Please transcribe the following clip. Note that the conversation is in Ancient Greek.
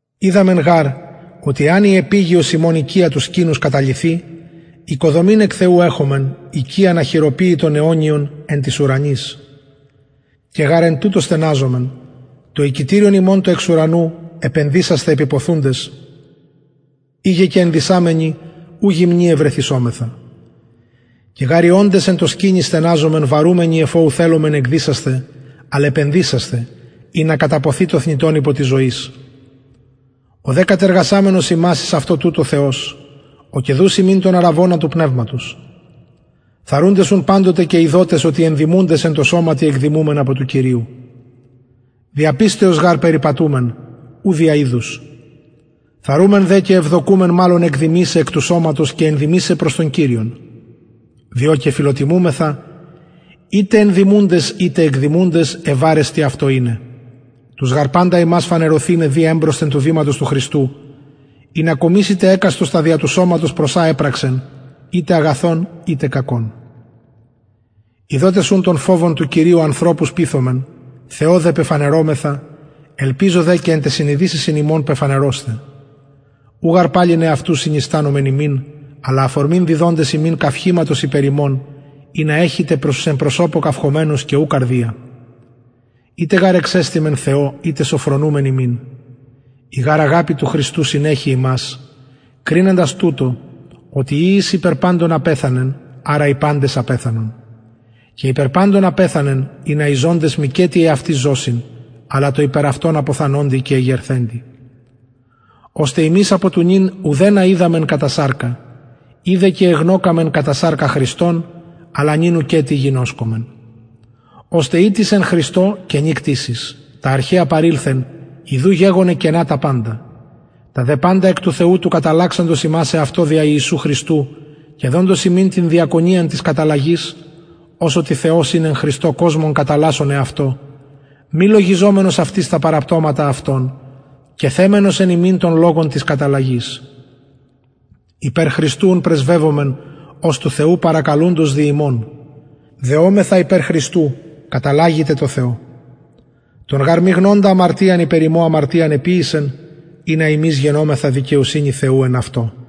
οιδαμεν γαρ οτι εαν η επιγειος ημων οικια του σκηνους καταλυθη οικοδομην εκ θεου εχομεν οικιαν αχειροποιητον αιωνιον εν τοις ουρανοις και γαρ εν τουτω στεναζομεν το οικητηριον ημων το εξ ουρανου επενδυσασθαι επιποθουντες ειγε και ενδυσαμενοι ου γυμνοι ευρεθησομεθα και γαρ οι οντες εν τω σκηνει στεναζομεν βαρουμενοι εφ ω ου θελομεν εκδυσασθαι αλλ επενδυσασθαι ινα καταποθη το θνητον υπο της ζωης ο δε κατεργασαμενος ημας εις αυτο τουτο θεος ο και δους ημιν τον αρραβωνα του πνευματος θαρρουντες ουν παντοτε και ειδοτες οτι ενδημουντες εν τω σωματι εκδημουμεν απο του κυριου δια πιστεως γαρ περιπατουμεν ου δια ειδους θαρρουμεν δε και ευδοκουμεν μαλλον εκδημησαι εκ του σωματος και ενδημησαι προς τον κυριον διο και φιλοτιμουμεθα ειτε ενδημουντες ειτε εκδημουντες ευαρεστοι αυτω ειναι τους γαρ παντας ημας φανερωθηναι δει εμπροσθεν του βηματος του χριστου ινα κομισηται εκαστος τα δια του σωματος προς α επραξεν ειτε αγαθον ειτε κακον ειδοτες ουν τον φοβον του κυριου ανθρωπους πειθομεν θεω δε πεφανερωμεθα ελπιζω δε και εν ταις συνειδησεσιν υμων πεφανερωσθαι ου γαρ παλιν εαυτους συνιστανομεν υμιν αλλα αφορμην διδοντες υμιν καυχηματος υπερ ημων ινα εχητε προς τους εν προσωπω καυχωμενους και ου καρδια ειτε γαρ εξεστημεν θεω ειτε σωφρονουμεν υμιν η γαρ αγαπη του χριστου συνεχει ημας κριναντας τουτο οτι ει εις υπερ παντων απεθανεν αρα οι παντες απεθανον και υπερ παντων απεθανεν ινα οι ζωντες μηκετι εαυτοις ζωσιν αλλα τω υπερ αυτων αποθανοντι και εγερθεντι ωστε ημεις απο του νυν ουδενα οιδαμεν κατα σαρκα ει δε και εγνωκαμεν κατα σαρκα χριστον αλλα νυν ουκετι γινωσκομεν ωστε ει τις εν χριστω καινη κτισις τα αρχαια παρηλθεν ιδου γεγονεν καινα τα παντα τα δε παντα εκ του θεου του καταλλαξαντος ημας εαυτω δια ιησου χριστου και δοντος ημιν την διακονιαν της καταλλαγης ως οτι θεος ην εν χριστω κοσμον καταλλασσων εαυτω μη λογιζομενος αυτοις τα παραπτωματα αυτων και θεμενος εν ημιν τον λογον της καταλλαγης υπερ χριστου ουν πρεσβευομεν ως του θεου παρακαλουντος δι ημων δεομεθα υπερ χριστου καταλλαγητε τω θεω τον γαρ μη γνοντα αμαρτιαν υπερ ημων αμαρτιαν εποιησεν ινα ημεις γενωμεθα δικαιοσυνη θεου εν αυτω